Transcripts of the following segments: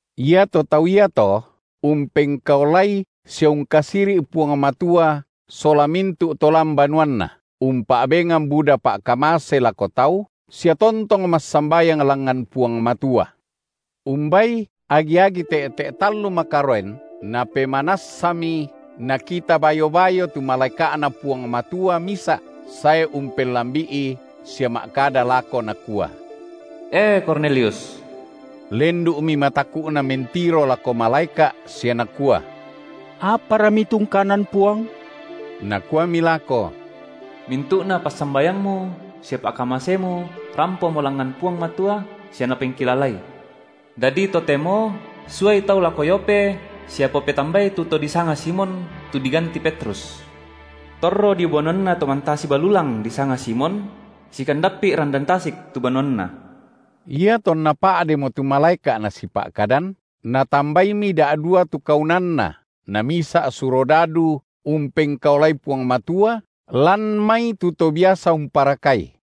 Iato tau iato umpengkaolai sia ungkasiri’ Puang Matua sola mintu’ to lan banuanna, umpa’bengan buda pa’kamase lako tau, sia tontong massambayang langngan Puang Matua. Umbai agi-agi te’te’ tallu makaroen napemanassami nakita bayo-bayo tu malaeka’Na Puang Matua misa’ sae umpelambi’i sia ma’kada lako nakua: E Kornelius! Lendu’mi mataku’na mentiro lako malaeka’ sia nakua: Apara mitungkanan, Puang? Nakuami lako: Mintu’na passambayangmu sia pa’kamasemu rampomo langngan Puang Matua sia Napengkilalai. Dadi totemo suai tau lako Yope sia popetambai tu to disanga Simon, tu diganti Petrus. Torro dio banuanna to mantasi balulang disanga Simon; sikandappi’ randan tasik tu banuanna. Iatonna pa’demo tu malaeka’ nasipa’kadan, natambaimi da’dua tu kaunanna, namisa’ surodadu umpengkaolai Puang Matua, lan mai tu to biasa umparakai;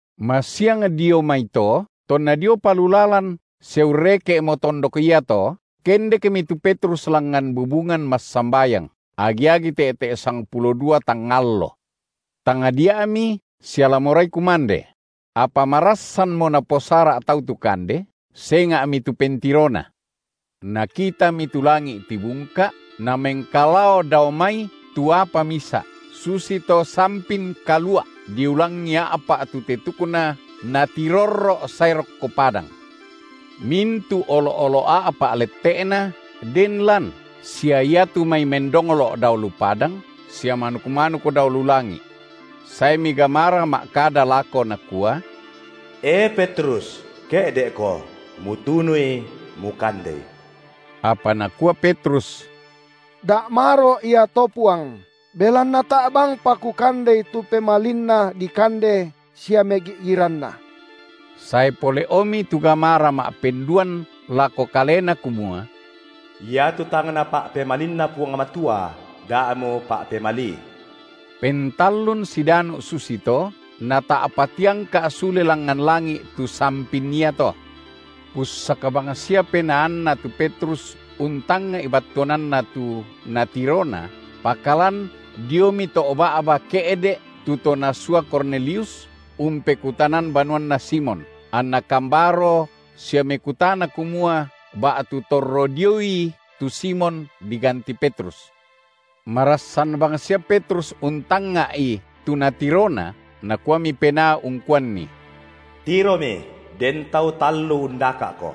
Masiang dio maito tonna diopa lu lalan sia urreke’mo tondok iato kendekmi tu Petrus langngan bubungan massambayang, agi-agi te’te’ sangpulo dua tangnga allo. Tangdia’mi sia la morai kumande; apa marassanmo naposara’ tau tu kande, senga’mi tu pentirona. Nakitami tu langi’ tibungka’, namengkalao dao mai tu apa misa’, susito sampin kalua’, diulangi a’pa’ tu tetukna natirorro’ sae rokko padang. Mintu’ olo’-olo’ a’pa’ lette’na den lan sia iatu mai mendonglo’ dao lu padang, sia manuk-manuk dao lu langi’. Saemi gamara ma’kada lako nakua: E, Petrus, ke’de’ko, mutunui, mukandei! Apa nakua Petrus: Da’ maro’ ia to Puang, belanna tae’ bangpa kukandei tu pemalinna dikande sia megi’giranna. Sae pole’omi tu gamara ma’penduan lako kalena kumua: Iatu tang Napa’pemalinna Puang Matua da mupa’pemalii. Pentallun sidanu’ susito, nata’pa tiangka’ sule langngan langi’ tu sampin iato. Pussak bangsia penaanna tu Petrus untangnga’i battuananna tu natirona, pakalan diomi to’ ba’ba ke’de’ tu to nasua Kornelius, umpekutanan banuanna Simon, anna kambaro sia mekutana kumua ba’tu torro dioi tu Simon, diganti Petrus. Marassan bangsia Petrus untangnga’i tu natirona, Nakuami Penaa ungkuanni: Tiromi, den tau tallu undaka’ko.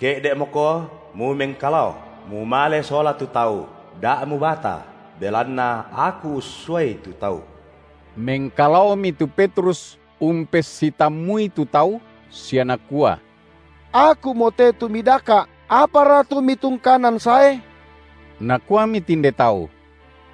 Ke’de’moko mumengkalao, mumale sola tu tau, da’ mubata, belanna Aku ussuai tu tau. Mengkalaomi tu Petrus umpessitammui tu tau, sia nakua: Akumote tu midaka’. Apara tu mitungkanan sae? Nakuami tinde tau: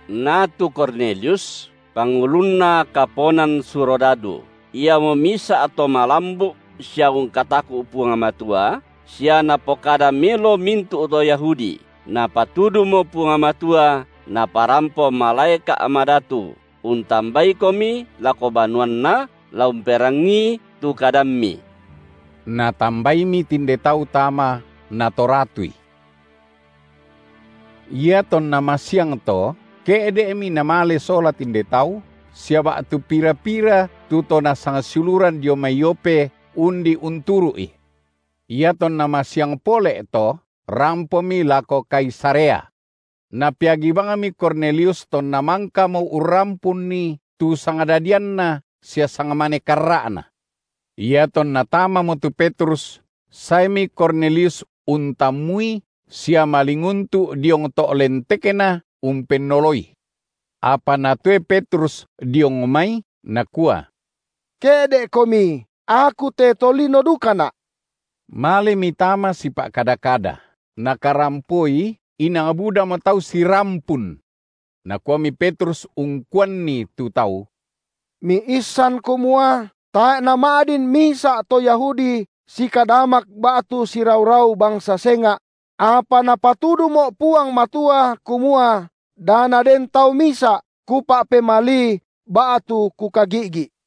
Na tu Kornelius, pangulunna kaponan surodadu, iamo misa’ to malambu’ sia ungkataku’ Puang Matua sia napokada melo mintu’ to Yahudi, Napatudumo Puang Matua naparampo malaeka’ madatu untambaikomi lako banuanna la umperangii tu kadammi. Natambaimi tinde tau tama natoratui. Iatonna masiangto ke’de’mi namale sola tinde tau, sia ba’tu pira-pira tu to nasangsiuluran dio mai Yope undi unturu’i. Iatonna masiang pole’to, rampomi lako Kaisarea. Napeagi bangmi Kornelius tonna mangkamo urrampunni tu sangdadianna sia sangmane karra’na. Iatonna tamamo tu Petrus, saemi Kornelius untammui sia malinguntu’ diong to’ lentekna umpennoloi. Apa natoe Petrus diong mai, nakua: Ke’de’komi, aku te tolino dukana’. Malemi tama sipa’kada-kada, nakarampoi inang budamo tau sirampun. Nakuami Petrus ungkuanni tu tau: Miissan kumua tae’ nama’din misa’ to Yahudi sikadamak ba’tu sirau-rau bangsa senga’; apa Napatudumo’ Puang Matua kumua da naden tau misa’ kupa’pemalii ba’tu kukagi’gi’.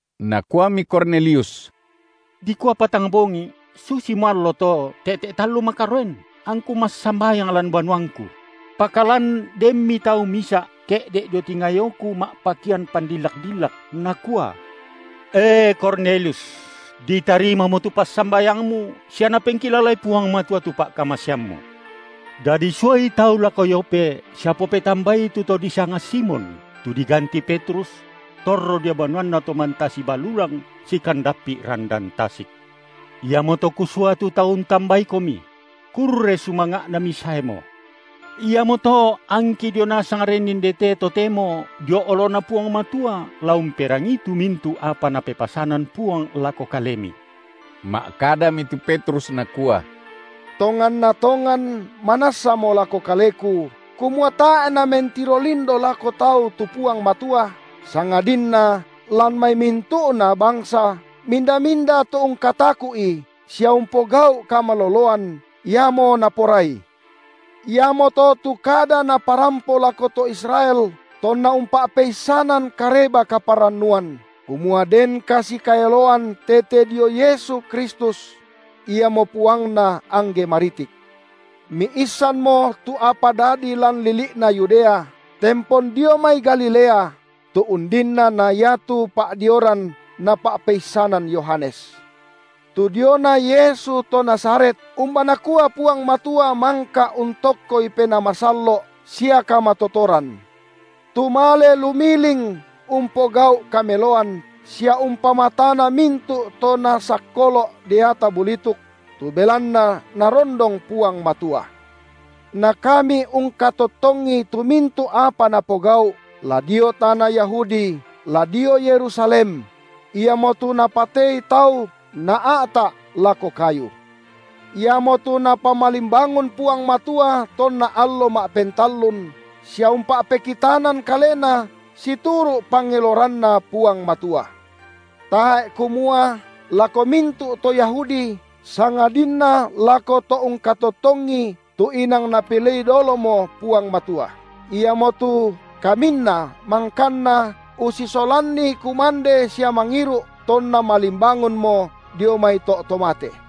Nakuami Kornelius: Dikua patang bongi’, susimo allo to, te’te’ tallu makaroen, angku massambayang lan banuangku; pakalan denmi tau misa’ ke’de’ dio tingayoku ma’pakean pandillak-dillak, nakua: E, Kornelius, ditarimamo tu passambayangmu, sia Napengkilalai Puang Matua tu pa’kamaseammu. Dadi suai tau lako Yope sia popetambai tu to disanga Simon, tu diganti Petrus; torro dio banuanna to mantasi balulang, sikandappi’ randan tasik. Iamoto kusua tu tau untambaikomi; kurre sumanga’na misaemo. Iamoto angki dio nasang ren indete totemo dio oloNa Puang Matua la umperangii tu mintu’ apa Napepasanan Puang lako kalemi. Ma’kadami tu Petrus nakua: Tonganna tongan manassamo lako kaleku, kumua tae’ Namentiro lindo lako tau tu Puang Matua, sangadinna lan mai mintu’na bangsa minda-minda tu ungkataku’i sia umpogau’ kamaloloan, iamo Naporai. Iamoto tu kada Naparampo lako to Israel tonna umpa’peissanan Kareba-kaparannuan, kumua den kasikaeloan tete dio Yesu Kristus; Iamo Puangna angge maritik. Miisanmo tu apa dadi lan lili’na Yudea, tempon dio mai Galilea, tu undinna na iatu pa’dioran napa’peissanan Yohanes, tu diona Yesu to Nazaret, umba nakua Puang Matua mangka untokkoI Penaa Masallo’ sia kamatotoran. Tu male lumiling umpogau’ kameloan, sia umpamatana mintu’ to nasakkolo’ deata bulituk; tu belanna Narondong Puang Matua. Na kami ungkatottongi tu mintu’ apa Napogau’, la dio tana Yahudi la dio Yerusalem; Iamotu napatei tau naa’ta’ lako kayu. Iamotu Napamalimbangun Puang Matua tonna allo ma’pentallun, sia umpa’pekitanan Kalena situru’ pangeloranNa Puang Matua, tae’ kumua lako mintu’ to Yahudi, sangadinna lako to ungkatottongi tu inang Napilei dolomo Puang Matua, iamotu kaminna mangkanna ussisolanNi kumande sia mangiru’ tonNa malimbangunmo dio mai to’ to mate;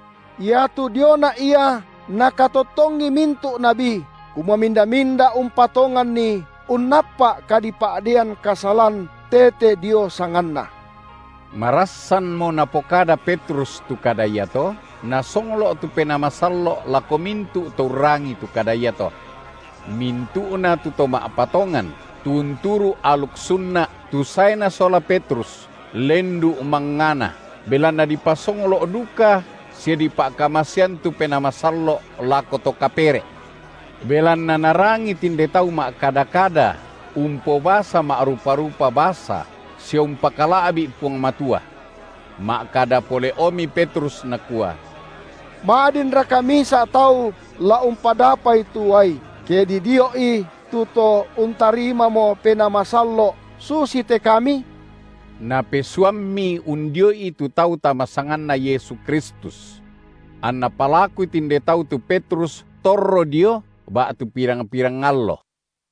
Iatu diona Ia nakatottongi mintu’ nabi, kumua minda-minda umpatonganNi unnappa’ kadipa’deian kasalan tete dio sanganNa. Marassanmo napokada Petrus tu kada iato, Nasonglo’ tu Penaa Masallo’ lako mintu’ to urrangii tu kada iato. Mintu’na tu to ma’patongan, tu unturu’ aluk sunna’, tu saena sola Petrus, lendu’ mangngana, belanna dipasonglo’ duka sia dipa’kamasean tu Penaa Masallo’ lako to kapere’. Belanna narangi tinde tau ma’kada-kada umpobasa ma’rupa-rupa basa sia umpakala’bi Puang Matua. Ma’kada pole’omi Petrus nakua: Ma’dinraka misa’ tau la umpadapai tu uai, ke didio’i tu to untarimamo Penaa Masallo’ susite kami? Napesuammi undio’i tu tau tama sanganNa Yesu Kristus. Anna palakui tinde tau tu Petrus torro dio ba’tu pirang-pirang allo.